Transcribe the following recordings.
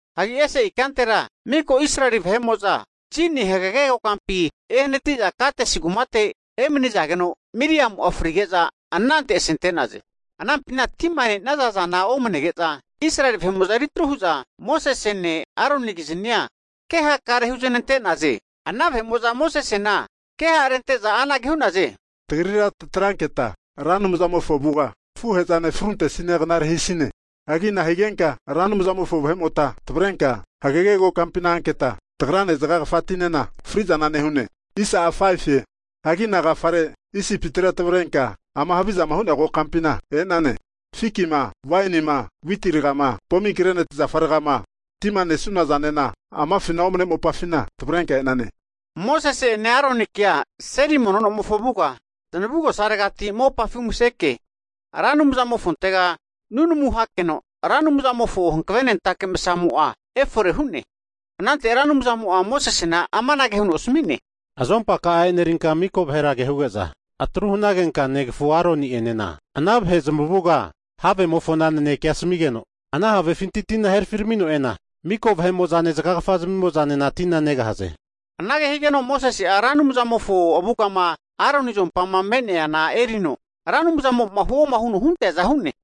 Hagi ese ikantera miko Israeli vahe'mo'za Zini hagege kokampi ehanati'za Kades kumate emani'nazageno, Miriamu'a frige'za anante asente'naze. Anampina tima ne'naza zana omanege'za, Israeli vahe'mo'za eritru hu'za Mosesene Aronikiznia kehakare huznante'naze. Ana vahe'mo'za Mosesena ke ha'rente'za anage hu'naze, tagrira tatranketa Ra Anumzamofo avuga tafuhe'zane fruntesina knare hisine! Hagi nahigenka Ra Anumzamofo vahe'mota tavrenka hagege ka'ma kokampina anketa, tagrane zagagafatinena fri'zana nehune? Hagi nagafare Isipitira tavrenka ama havizama hu'nea kokampina e'nane? Fikima, wainima witi ragama, pomigreneti zafa ragama, tima nesunazanena amafina omane mopafina tavrenka e'nane. Mosese'ene Aronikea seli nomofo avuga zanavugosaregati mopafi umaseke, Ra Anumzamofontega nunamu hakeno, Ra Anumzamofo hanavenentake msamo'a efore hu'ne. Anante Ra Anumzamo'a Mosesena amanage huno asami'ne. Azompaka'a enerinka mika vahera kehuge'za atru hanagenka negafu Aroni'enena ana vahe zamavuga havemofona nanekea asamigeno, ana havefinti tina herafiramino e'na, miko vahe'mo'zane zagagafa zmimozanena tina negahaze. Anage higeno Mosese'a Ra Anumzamofo avugama Aroni azompama me'neana erino, Ra Anumzamo'ma huoma huno hunteaza hu'ne.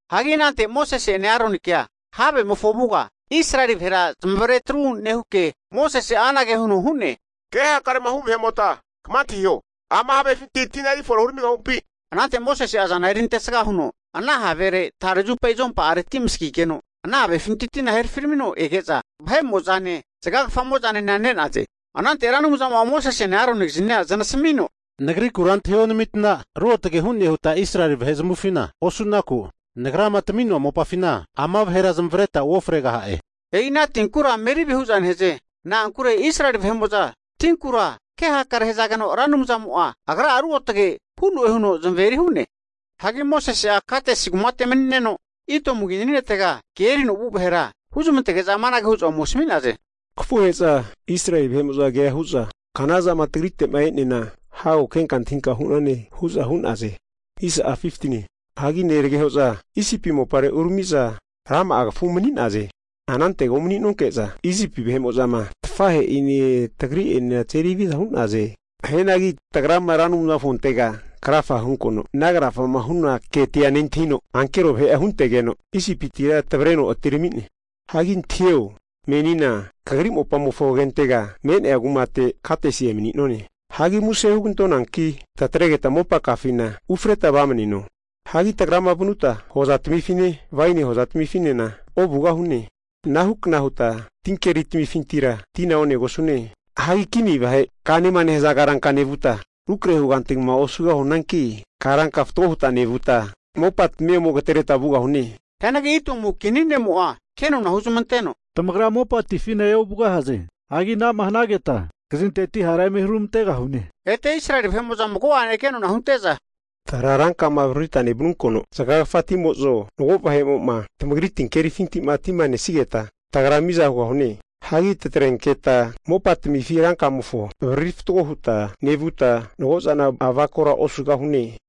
Hagi anante Mosese'ene Aronikea havemofo avuga Israeli vahera zamazeri atru nehuke, Mosese'a anage huno hu'ne, kehakare'ma hu vahe'mota kama antahiho, ama havefinti tina erifore huramigahupi? Anante Mosese'a azana erintesaga huno ana havere tare zupa azompa'aretira amasagigeno ana havefintira tina herafino ege'za vahe'mo'zane zagagafazaminena ne'naze. Anante Ra Anumzamo'a Mosesene Aronikiznia zanasamino, Nagrikura antahionamitna, ruotge hu'ne huta Israeli vahe zmavufina osu'naku, Nagrama tami'noa mopafina ama vahera zamavareta uofregaha'e. E'ina tinkura Meribe hu'za nehaze. Na'ankure Israeli vahe'mo'za, tinkura kehakare hazageno Ra Anumzamo'a Agra'a ruotage hu'noe huno zamaveri hu'ne. Hagi Mosese'a Kadesi kumate mani'neno Idomu kini ne'tega ke erino vu vahera huzmantege'za amanage hu'za ome asami'naze. Kafuhe'za Israeli vahe'mo'za kea hu'za, Knazama tagrite'ma e'neana, hago kenka antahinka hu'nane hu'za hu'naze. Hagi neragehoza Isipi mopare urami'za rama'a kafu umani'naze. Anantega umani'nonke'za Isipi vahe'mo'zama tafahe'ine tagri'enena tazeri haviza hu'naze. Hianagi tagrama Ra Anumzamofontega krafa huntonkeno ana krafama huna ketia nentahino, ankero vahe'a huntegeno, Isipitira tavreno atirami'ne. Hagi antahio, menina kagri mopamofo agentega me'nea kumate Kadesi emani'none. Hagi muse hugantoanki tatregeta mopakafina ufreta vamaneno. Hagi tagrama vanuta hozatamifine waini hozatamifinena ovugahune. Anahukna huta tinkeri tamifintira tina onegosune. Hagi kini vahe kanema nehaza karanka nevuta, rukrahe huganti hugama osugahunanki, karanka fatgo huta nevuta mopatamia ome agatereta vugahune. Hianagi Idomu kini ne'mo'a kenona huzamanteno, tamagra mopatifina eovugahaze. Hagi anama hanageta, kazinteti hara eme huramantegahune. Ete Israeli vahe'mo'za mago'ane kenona hunte'za, tagra rankama avaririta nevanunkeno zagagafatimo'zo, mago vahe'mo'ma tamagri tinkerifinti'ma tima nesigeta, tagra miza hugahune. Hagi tatrenketa mopatamifi rankamofo avariri fatgo huta nevuta mago'zana avakora osugahune.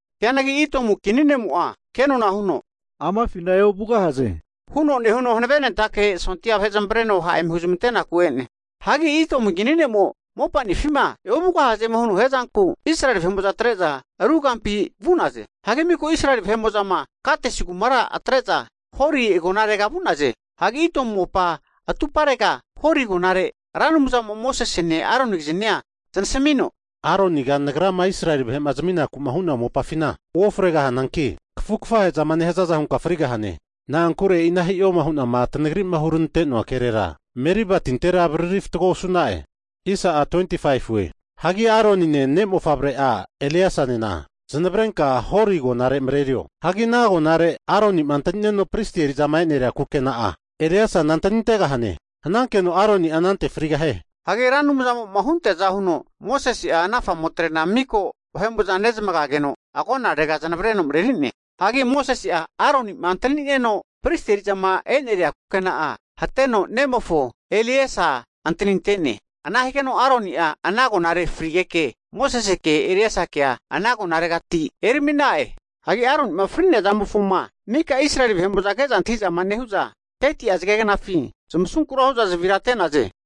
Hianagi Idomu kini ne'mo'a kenona huno, amafina eovugahaze, huno nehuno hanavenentake sondia vahe zamavreno ha' eme huzmante'naku e'ne. Hagi Idomu kini ne'mo'ma mopanifima e'ovugahazema huno hiazanku, Israeli vahe'mo'za atre'za, ru kampi vu'naze. Hagi miko Israeli vahe'mo'zama Kadesi kumara atre'za Hori agonarega vu'naze. Hagi Idomu mopa atuparega Hori agonare Ra Anumzamo'a Mosesene Aronikiznia zanasamino, Aroniga Nagrama Israeli vahe'ma zaminaku'ma hu'noa mopafina uofregahananki, kafu kafahe'zama nehazaza hunka frigahane. Na'ankure e'ina hi'o hu'na tanagri'ma huranantoa kerera Meriba tintera avariri fatgo osu'na'e. Hagi Aronine ne' mofavre'a Elieasanena zanavrenka Hori agonare mareri'o. Hagi ana agonare Aronima antani'neno pristi eri'zama eneria kukena'a, hatenka ne'mofo Elieasana antanintegahane. Hanankeno Aroni'a anante frigahie. Hagi Ra Anumzamo'ma hunteaza huno Mosese'a ana famotrena miko vahe'mo'za nezamageno agonarega zanavreno mareri'ne. Hagi Mosese'a Aroni'ma antani'neno pristi eri'zama eneria kukena'a hateno nemofo Elieasa antaninte'ne. Ana higeno Aroni'a ana agonare frigeke, Moseseke Elieasakea ana agonaregati erami'na'e. Hagi Aroni'ma fri'nea zamofoma maka Israeli vahe'mo'zama ke'za antahi'zama nehu'za, 30'a zage knafi zamasunkura hu'za zavira ate'naze.